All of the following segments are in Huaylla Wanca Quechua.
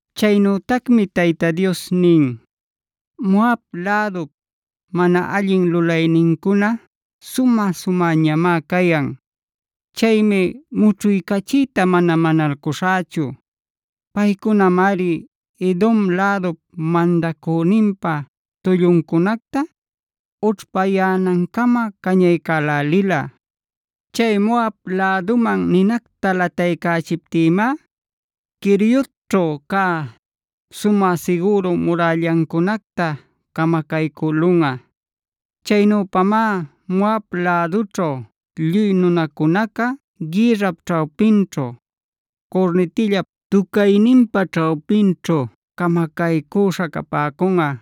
Chaynütacmi Tayta Dios nin: “Moab lädup mana allin lulaynincuna sumä-sumäñamá cayan.a Chaymi mućhuycachiyta mana manalcuśhächu. Paycunamari Edom lädup mandacüninpa tulluncunacta ućhpayänancamab cañälälila. Chay Moab läduman ninacta lataycächiptïmá Queriotćhu cä sumä sigüru murällancunacta camacaycülunꞌa. Chaynüpamá Moab lädućhu lluy nunacunaca gïrrap ćhawpinćhu, curnitillap tucayninpa ćhawpinćhu camacaycüśha capäcunꞌa.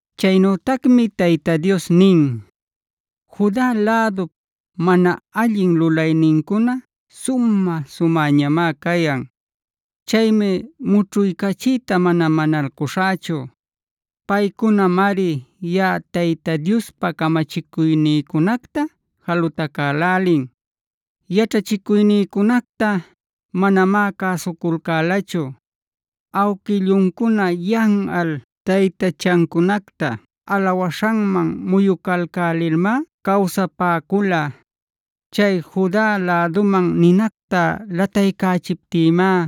Chaynütacmi Tayta Dios nin: “Juda lädupc mana allin lulaynincuna sumä-sumäñamá cayan. Chaymi mućhuycachiyta mana manalcuśhächu. Paycunamari yaꞌa Tayta Diospa camachicuynïcunacta jalutacälälin; yaćhachicuynïcunacta manamá cäsuculcälachu. Awquilluncuna yanꞌal taytachancunacta alawaśhanman muyucalcälilmá cawsapäcula. Chay Juda läduman ninacta lataycächiptïmá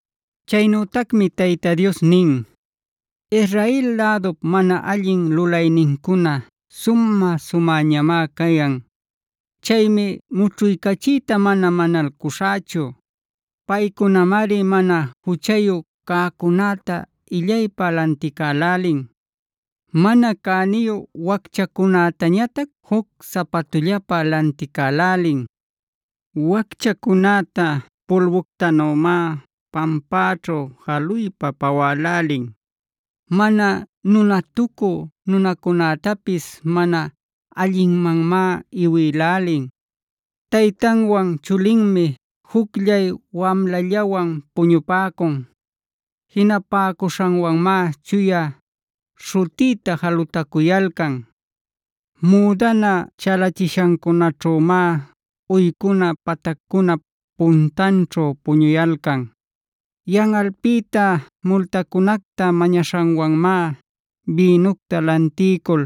Chaynütacmi Tayta Dios nin: “Israel lädup mana allin lulaynincuna sumä-sumäñamá cayan. Chaymi mućhuycachiyta mana manalcuśhächu. Paycunamari mana juchayu cäcunäta illaypä lanticälälin; mana cäniyu wacchacunätañatac juc sapatullapä lanticälälin. Wacchacunäta pulbuctanümá pampäćhu jaluypa pawälälin. Mana nunatucü nunacunätapis mana allinmanmá iwïlälin. Taytanwan chulinmi jucllay wamlallawan puñupäcun. Jinapäcuśhanwanmá chuya śhutïta jalutacuyalcan. Müdana chalachishancunaćhümá uycuna pataccunap puntanćhu puñuyalcan.e Yanꞌalpïta multacunacta mañaśhanwanmá bïnucta lantiycul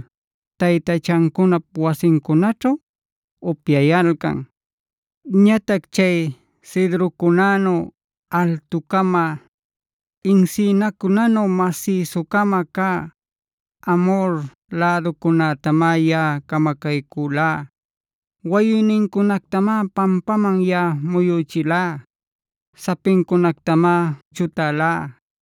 taytachancunap wasincunaćhu upyayalcan. Ñatac chay cedrocunänu altu-cama, encinacunänu masïsu-cama cä Amhor läducunätamá yaꞌa camacaycülá.f Wayuynincunactamá pampaman yaꞌa muyüchilá; sapincunactamá chutälá.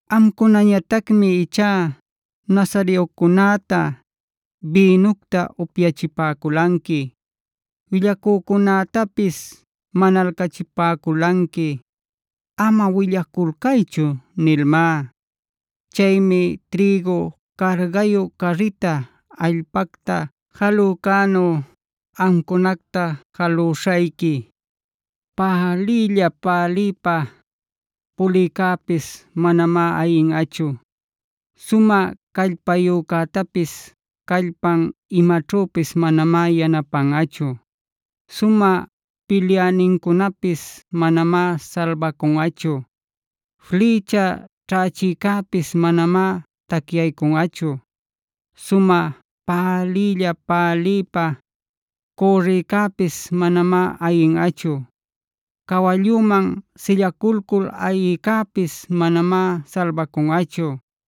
“Amcunañatacmi ichá nazareocunätai bïnucta upyachipäculanqui. Willacücunätapis manalcachipäculanqui ‘Ama willaculcaychu’ nilmá. Chaymi trïgu cargayu carrita allpacta jalücänu amcunacta jalüśhayqui. Päliylla-päliypa pulïcäpis manamá ayinꞌachu. Sumä callpayücätapis callpan imaćhüpis manamá yanapanꞌachu. Sumä pilyänincunapis manamá salbacunꞌachu. Flïcha ćhächïcäpis manamá tacyaycunꞌachu. Sumä päliylla-päliypa cürrïcäpis manamá ayinꞌachu. Cawalluman sillaculcul ayïcäpis manamá salbacunꞌachu.